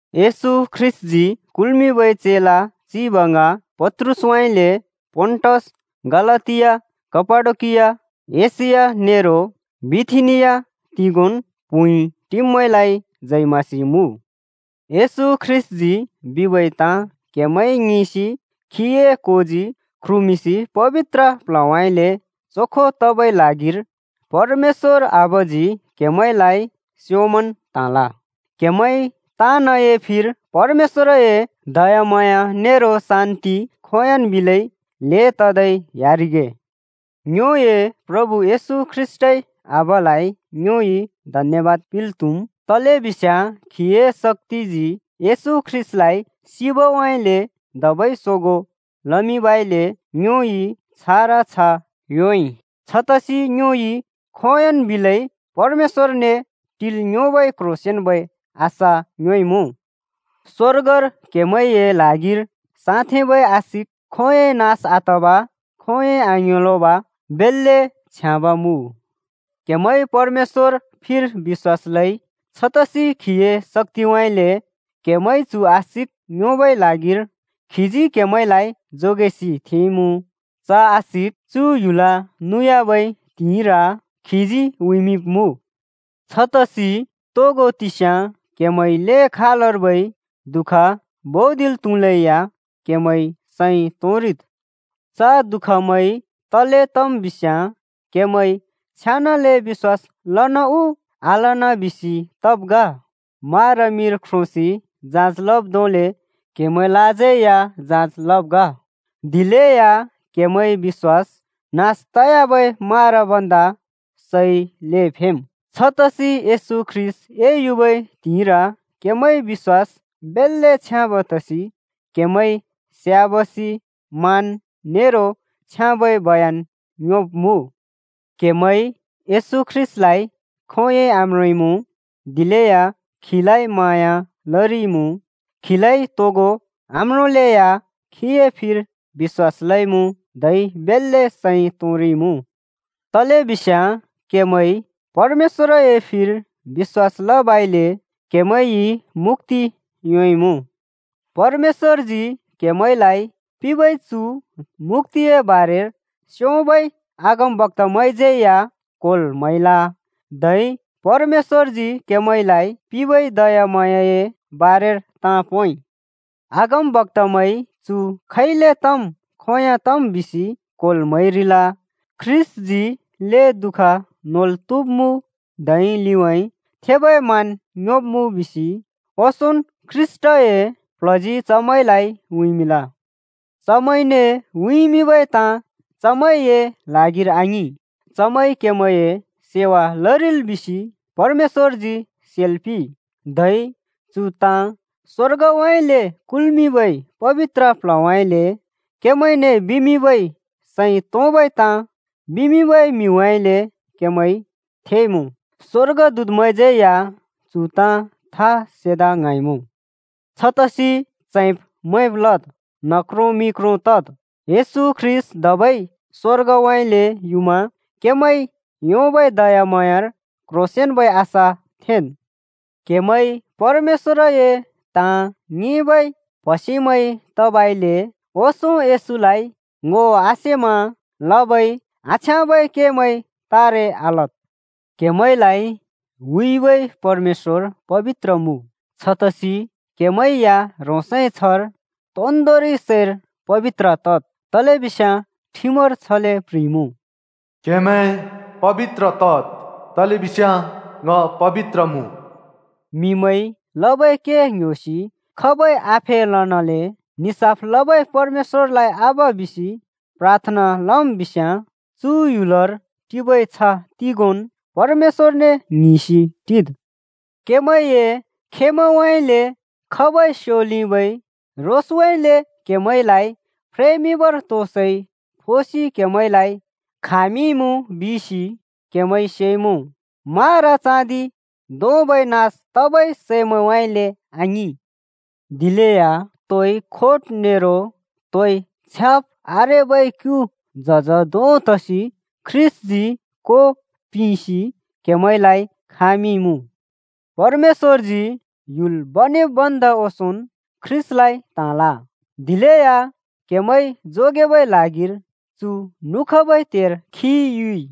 येशू ख्रीष्‍टजी कुल्मिंबै चेला चिब ङ पत्रुसउँइँले पोन्टस, गलातिया, कापाडोकिया, एशिया नेरो बिथिनिया तिगोंन् प्हुँइ टिब्मैंलाइ जय मसीह मुँ! येशू ख्रीष्‍टजी बिबै ताँ क्हेमैंइ ङिंसि खीए कोजी ख्रुमिंसि पबित्र प्ल्हउँइँले चोखो तबै ल्हागिर परमेश्‍वर आबाजी क्हेमैंलाइ स्योंमन् त्हाँल। क्हेमैं ताँनए फिर परमेश्‍वरए दयाम्हाँया नेरो शान्ति खोंयोंन् बिलै ल्हें ततै ह्‍यारिगे। ङ्योए प्रभु येशू ख्रीष्‍टए आबालाइ ङ्योइ धन्‍यबाद पिंल् त्हुम्! तलेबिस्याँ खीए शक्‍तिजी येशू ख्रीष्‍टलाइ सिबउँइँले धबै सोगों लमिंबइले ङ्योइ छारा छ्ह योंइ। छतसि ङ्योइ खोंयोंन् बिलै परमेश्‍वरने टिल् योंबै क्ह्रोंसेंन्बै आशा योंइमुँ। स्वर्गर क्हेमैंए ल्हागिर साँथेंबै आशिक खोंयोंइ नास आतब, खोंयोंइ आङ्योंलोंब बेल्‍ले छ्याँब मुँ। क्‍हेमैंइ परमेश्‍वर फिर बिश्‍वास लइ। छतसि खीए शक्‍तिउँइँले क्‍हेमैंइ चु आशिक योंबै ल्हागिर खीजी क्हेमैंलाइ जोगेसि थेंइमुँ। च आशिक चु ह्‍युल नुयाबै त्हिंइर खीजी उँइँमिंब्‍मुँ। छतसि तोगो तिस्या क्हेमैंइ ल्हें खालर्बै दुःख भुँदिल् त्‍हुलेया क्हेमैं सैं तोंरिद्। च दुःखमैं तले तम् बिस्याँ क्‍हेमैंइ छेनाले बिश्‍वास लन उ आलन बिसि तब् ग। मारा मिर ख्रोंसि जाँच लब् धोंले क्‍हेमैंलाज्यै या जाँच लब् ग, दिलेया क्‍हेमैंए बिश्‍वास नास तयाबै मारा भन्दा सै ल्हें फेम्। छतसि येशू ख्रीष्‍ट एयुबै त्हिंइर क्‍हेमैंए बिश्‍वास बेल्‍ले छ्याँब तसि क्हेमैंइ स्याबासि, मान नेरो छ्याँबै बयन योंब्मुँ। क्‍हेमैंइ येशू ख्रीष्‍टलाइ खोंयोंइ आम्रोंइमुँ, दिलेया खीलाइ म्हाँया लरिइमुँ। खीलाइ तोगो आम्रोंलेया खीए फिर बिश्‍वास लइमुँ। धै बेल्‍ले सैं तोंरिइमुँ, तलेबिस्‍याँ क्‍हेमैंइ परमेश्‍वरए फिर बिश्‍वास लबइले क्हेमैंइ मुक्‍ति योंइमुँ। परमेश्‍वरजी क्‍हेमैंलाइ पिंबै चु मुक्‍तिए बारेर स्योंम्बै अगमक्‍तामैंज्यै या क्होल् म्हैल, धै परमेश्‍वरजी क्‍हेमैंलाइ पिंबै दयाम्हाँयाए बारेर ताँ पोंइ। अगमबक्‍तामैंइ चु खैले तम् खोंयों तम् बिसि क्होल् म्हैरिल। ख्रीष्‍टजी ल्हें दु:ख नोल् त्हुब्मुँ धै लिउँइँ थेबै मान योंब्मुँ बिसि ओंसोंन् ख्रीष्‍टए प्ल्हजी चमैंलाइ उँइँमिंल। चमैंने उँइँमिंबै ताँ चमैंए ल्हागिर आङिं, चमैंइ क्‍हेमैंए सेवा लरिल बिसि परमेश्‍वरजी सेल् पिंइ। धै चु ताँ स्वर्गउँइँले कुल्मिंबै पबित्र प्ल्हउँइँले क्हेमैंने सैं तोंबै ताँ बिमिंबै म्हिमैंउँइँले क्हेमैंइ थेइमुँ। स्‍वर्गदूतमैंज्यै या चु ताँ था सेदा ङ्हाँइमुँ। छतसि च्हैंब् मैंब् लद्, न्ह क्रों मि क्रों तद्। येशू ख्रीष्‍ट धबै स्‍वर्गउँइँले युमा क्हेमैंइ योंबै दयाम्हाँयार क्ह्रोंसेंन्बै आशा थेंन्। क्‍हेमैं परमेश्‍वरए ताँ ङिंबै प्‍हसेमैं तबइले ओंसों येशूलाइ ङो आसेमा लबै आछ्याँबै केमैं तारे आलद्। क्‍हेमैंलाइ हुइबै परमेश्‍वर पबित्र मुँ, छतसि क्हेमैं या ह्रोंसए छ्हर तोन्दोंरि सैर पबित्र तद्। तलेबिस्याँ ठिमर छले प्ह्रिइमुँ, “क्हेमैं पबित्र तद्, तलेबिस्याँ ङ पबित्र मुँ।” म्हिमैंइ लबै के ङ्‍ह्‍योसि खाबै आफेलनाले निसाफ लबै परमेश्‍वरलाइ आबा बिसि प्राथना लम् बिस्याँ, चु ह्‍युलर टिबै छ्ह तिगोंन् परमेश्‍वरने ङ्हिंसि टिद्। क्‍हेमैंए खेमैंउँइँले खबै स्योलिबै रोसउँइँले क्‍हेमैंलाइ फ्रेमिंबर तो सै फोसि क्हेमैंलाइ खामिंइमुँ बिसि क्हेमैंइ सेइमुँ। मारा चाँदि धोंबै नास तबै सैमैंउँइँले आङिं, दिलेया तोइ खोट नेरो तोइ छ्याब् आरेबै क्यु झज धों तसि ख्रीष्‍टजी को पिंसि क्हेमैंलाइ खामिंइमुँ। परमेश्‍वरजी ह्‍युल बनेब् भन्दा ओंसोंन् ख्रीष्‍टलाइ त्‍हाँल, दिलेया क्हेमैं जोगेबै ल्हागिर चु नुखबै त्हेर खी युइ।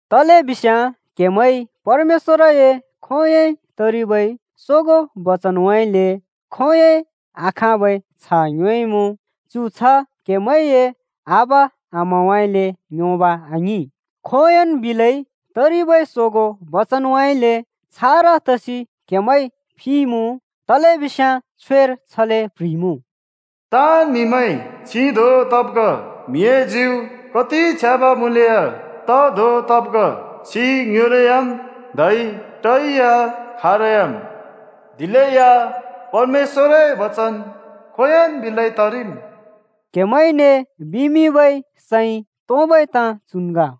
तलेबिस्याँ क्‍हेमैंइ परमेश्‍वरए खोंयोंइ तरिबै सोगों बचनउँइँले खोंयोंइ आखाँबै छ्ह योंइमुँ। चु छ्ह क्‍हेमैंए आबा-आमाउँइँले योंब आङिं, खोंयोंन् बिलै तरिबै सोगों बचनउँइँले छारा तसि क्‍हेमैं फिइमुँ। तलेबिस्याँ छ्वेर छले प्ह्रिइमुँ, “ताँन् म्‍हिमैं छि धों तब् ग, म्‍हिए ज्यु कति छ्याँब मुँलेया ट धों तब् ग। छि ङ्योंलोयाम् धै टै या खारयाम्। दिलेया परमेश्‍वरए बचन खोंयोंन् बिलै तरिम्।” क्‍हेमैंने बिमिंबै सैं तोंबै ताँ चुन् ग।